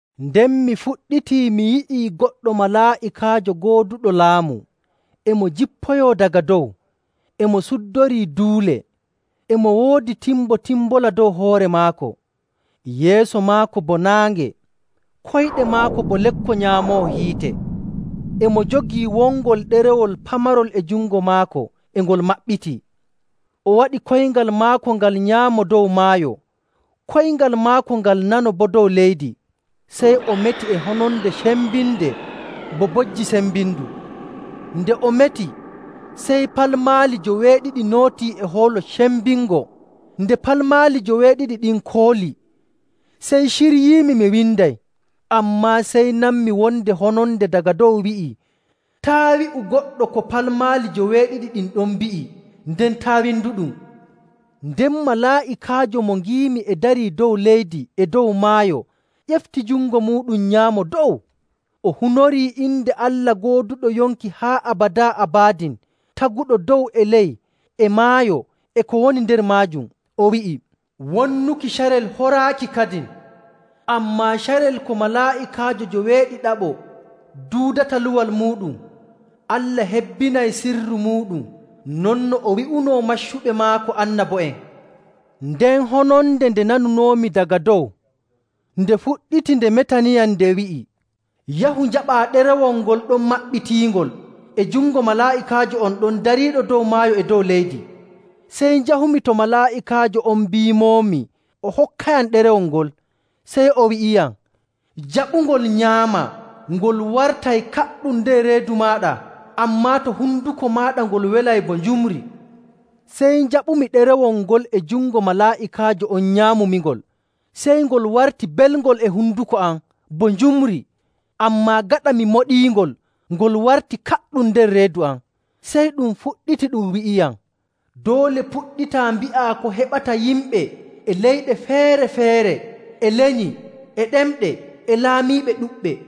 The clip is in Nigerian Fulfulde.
Nden mi fuɗɗitii mi yi'i goɗɗo malaa'ikaajo gooduɗo laamu, e mo jippoyoo daga dow, e mo suddorii duule. E mo woodi timbotimbola dow hoore maako, yeeso maako bo naange, koyɗe maako bo lekko nyaamooho hiite. E mo jogii wongol ɗerewol pamarol e jungo maako e ngol maɓɓitii. O waɗi koyngal maako ngal nyaamo dow maayo, koyngal maako ngal nano boo dow leydi. Sey o meti e hononde cembinde bo bojji sembindu. Nde o meti, sey palmaali joweeɗiɗi nootii e hoolo cembingo. Nde palmaali joweeɗiɗi ɗin kooli, sey ciryiimi mi winday. Ammaa sey nanmi wonde hononde daga dow wi'ii, “Taa' wi'u goɗɗo ko palmaali joweeɗiɗi ɗin ɗon mbi'i nden taa' winduɗum!” Nden malaa'ikaajo mo ngiimi e darii dow leydi e dow maayo ƴefti jungo muuɗum nyaamo dow. O hunorii inde Allah gooduɗo yonki haa abadaa abadin, taguɗo dow e ley e maayo e ko woni nder maajum. O wi'i, “Wonnuki carel horaaki kadin! Ammaa carel ko malaa'ikaajo joweeɗiɗaɓo duudata luwal muuɗum, Allah hebbinay sirru muuɗum, non no o wi'unoo maccuɓe maako annabo'en.” Nden hononde nde nanunoomi daga dow, nde fuɗɗitii nde metaniiyam nde wi'i, “Yahu njaɓaa ɗerewol ngol ɗon maɓɓitiingol e jungo malaa'ikaajo on ɗon dariiɗo dow maayo e dow leydi.” Sey njahumi to malaa'ikaajo on mbiimoomi o hokkayam ɗerewol ngol. Sey o wi'iyam, “Jaɓungol nyaamaa. Ngol wartay kaɗɗum nder reedu maaɗa, ammaa to honduko maaɗa ngol welay bo njumri.” Sey njaɓumi ɗerewol ngol e jungo malaa'ikaajo on nyaamumingol. Sey ngol warti belngol e honduko am bo njumri, ammaa gaɗa mi moɗiingol ngol warti kaɗɗum nder reedu am. Sey ɗum fuɗɗiti ɗum wi'iyam, “Doole puɗɗitaa mbi'a ko heɓata yimɓe e leyɗe feere‑feere, e lenyi, e ɗemɗe, e laamiiɓe ɗuɗɓe.”